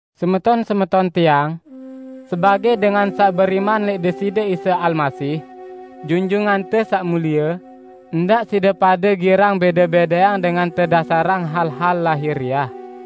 Semeton-semeton tiang! Sebagẽ dengan saq beriman lẽq Deside Isa Almasih, Junjungante Saq Mulie, ndaq side pade girang bẽde-bẽdeang dengan tedasarang hal-hal lahiriah.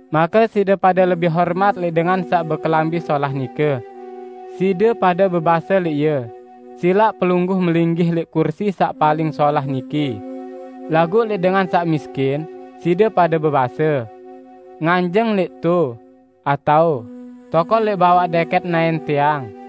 make side pade lebih hormat lẽq dengan saq bekelambi solah nike. Side pade bebase lẽq ie, "Silaq pelungguh melinggih lẽq kursi saq paling solah niki," laguq lẽq dengan saq miskin, side pade bebase, "Nganjeng lẽq to!" atao "Tokol lẽq bawaq dẽkẽt naẽn tiang."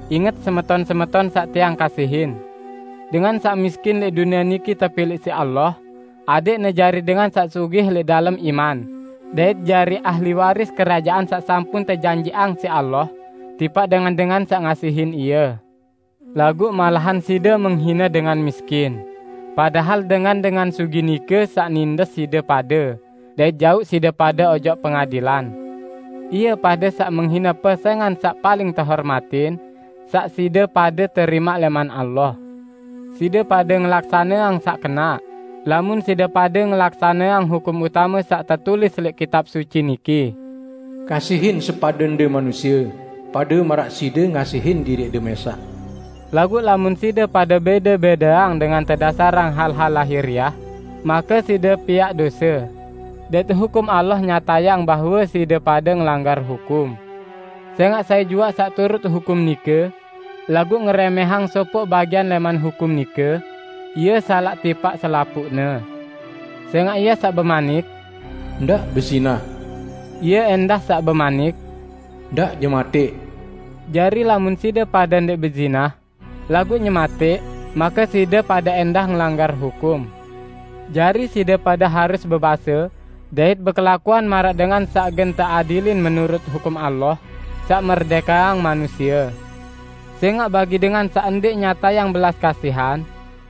Inget, semeton-semeton saq tiang kasihin! Dengan saq miskin lẽq dunie niki tepilẽq siq Allah adẽqne jari dengan saq sugih lẽq dalem iman dait jari ahli waris Kerajaan saq sampun tejanjiqang siq Allah tipaq dengan-dengan saq ngasihin Ie. Laguq malahan side menghine dengan miskin, padahal dengan-dengan sugih nike saq nindes side pade dait jauq side pade ojok pengadilan! Ie pade saq menghine pesẽngan saq paling tehormatin saq side pade terimaq lẽman Allah. Side pade ngelaksaneang saq kenaq, lamun side pade ngelaksaneang hukum utame saq tetulis lẽq Kitab Suci niki, "Kasihin sepadende manusie, pade maraq side ngasihin diriqde mẽsaq." Laguq lamun side pade bẽde-bẽdeang dengan tedasarang hal-hal lahiriah, make side piaq dose, dait hukum Allah nyatayang bahwe side pade ngelanggar hukum. Sẽngaq sai juaq saq turut hukum nike, laguq ngerẽmẽhang sopoq bagian lẽman hukum nike, ie salaq tipaq selapuqne. Sẽngaq Ie saq bemanik, "Ndaq bezinah," Ie ẽndah saq bemanik, "Ndaq nyematẽq." Jari lamun side pade ndẽq bezinah, laguq nyematẽq make side pade ẽndah ngelanggar hukum. Jari side pade harus bebase dait bekelakuan maraq dengan saq gen teadilin menurut hukum Allah saq merdẽkeang manusie. Sẽngaq bagi dengan saq ndẽq nyatayang belas kasihan,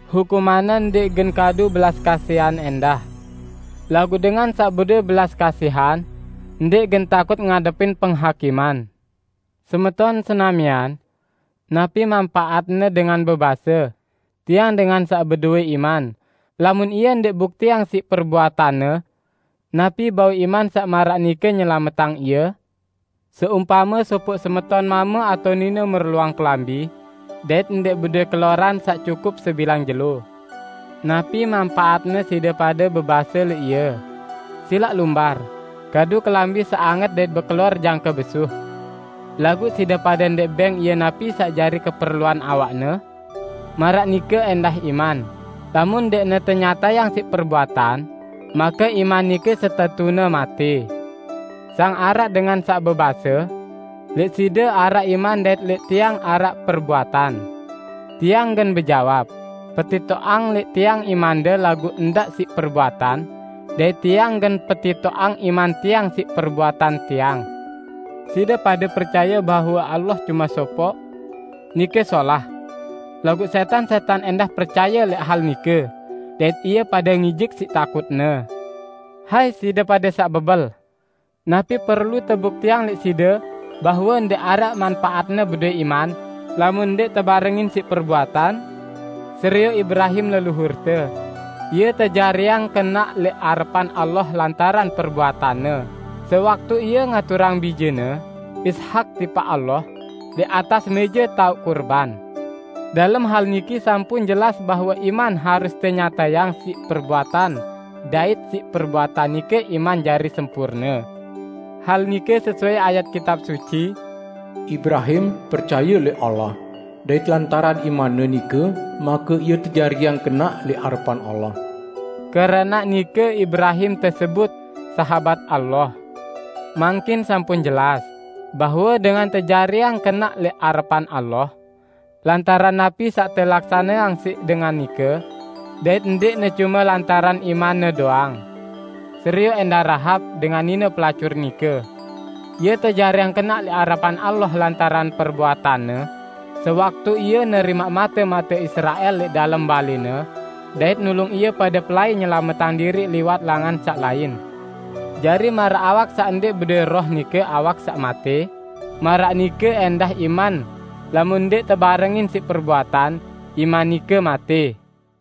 hukumanne ndẽq gen kadu belas kasihan ẽndah, laguq dengan saq bedowẽ belas kasihan ndẽq gen takut ngadepin penghakiman! Semeton senamian! Napi manpaatne dengan bebase, "Tiang dengan saq bedowẽ iman," lamun ie ndẽq buktiang siq perbuatanne? Napi bau iman saq maraq nike nyelametang ie? Seumpame sopoq semeton mame atao nine merluang kelambi dait ndẽq bedowẽ keloran saq cukup sebilang jelo. Napi manpaatne side pade bebase lẽq ie, "Silaq lumbar, kadu kelambi saq anget dait bekelor jangke besuh!", laguq side pade ndẽq bẽng ie napi saq jari keperluan awakne? Maraq nike ẽndah iman, lamun ndẽqne tenyatayang siq perbuatan, make iman nike setetune matẽ. Sang araq dengan saq bebase, "Lẽq side araq iman dait lẽq tiang araq perbuatan." Tiang gen bejawab, "Petitoqang lẽq tiang imande laguq ndaq siq perbuatan, dait tiang gen petitoqang iman tiang siq perbuatan tiang." Side pade percaye bahwe Allah cume sopoq? Nike solah! Laguq sẽtan-sẽtan ẽndah percaye lẽq hal nike dait ie pade ngijik siq takutne! Hai side pade saq bebel! Napi perlu tebuktiang lẽq side bahwe ndẽq araq manpaatne bedowẽ iman lamun ndẽq tebarengin siq perbuatan? Serioq Ibrahim leluhurte! Ie tejariang kenaq lẽq arepan Allah lantaran perbuatanne, sewaktu ie ngaturang bijene, Ishak tipaq Allah, lẽq atas mẽje taoq kurban. Dalem hal niki sampun jelas bahwe iman harus tenyatayang siq perbuatan dait siq perbuatan nike iman jari sempurne. Hal nike sesuai ayat Kitab Suci, "Ibrahim percaye lẽq Allah, dait lantaran imanne nike make ie tejariang kenaq lẽq arepan Allah." Keranaq nike Ibrahim tesebut, "Sahabat Allah." Mangkin sampun jelas, bahwe dengan tejariang kenaq lẽq arepan Allah, lantaran napi saq telaksaneang siq dengan nike, dait ndẽqne cume lantaran imanne doang. Serioq ẽndah Rahab, dengan nine pelacur nike. Ie tejariang kenaq lẽq arepan Allah lantaran perbuatanne, sewaktu ie nerimaq mate-mate Israel lẽq dalem balẽne dait nulung ie pade pelai nyelametang diriq liwat langan saq lain. Jari, maraq awak saq ndẽq bedowẽ roh, nike awak saq matẽ, maraq nike ẽndah iman, lamun ndẽq tebarengin siq perbuatan, iman nike matẽ.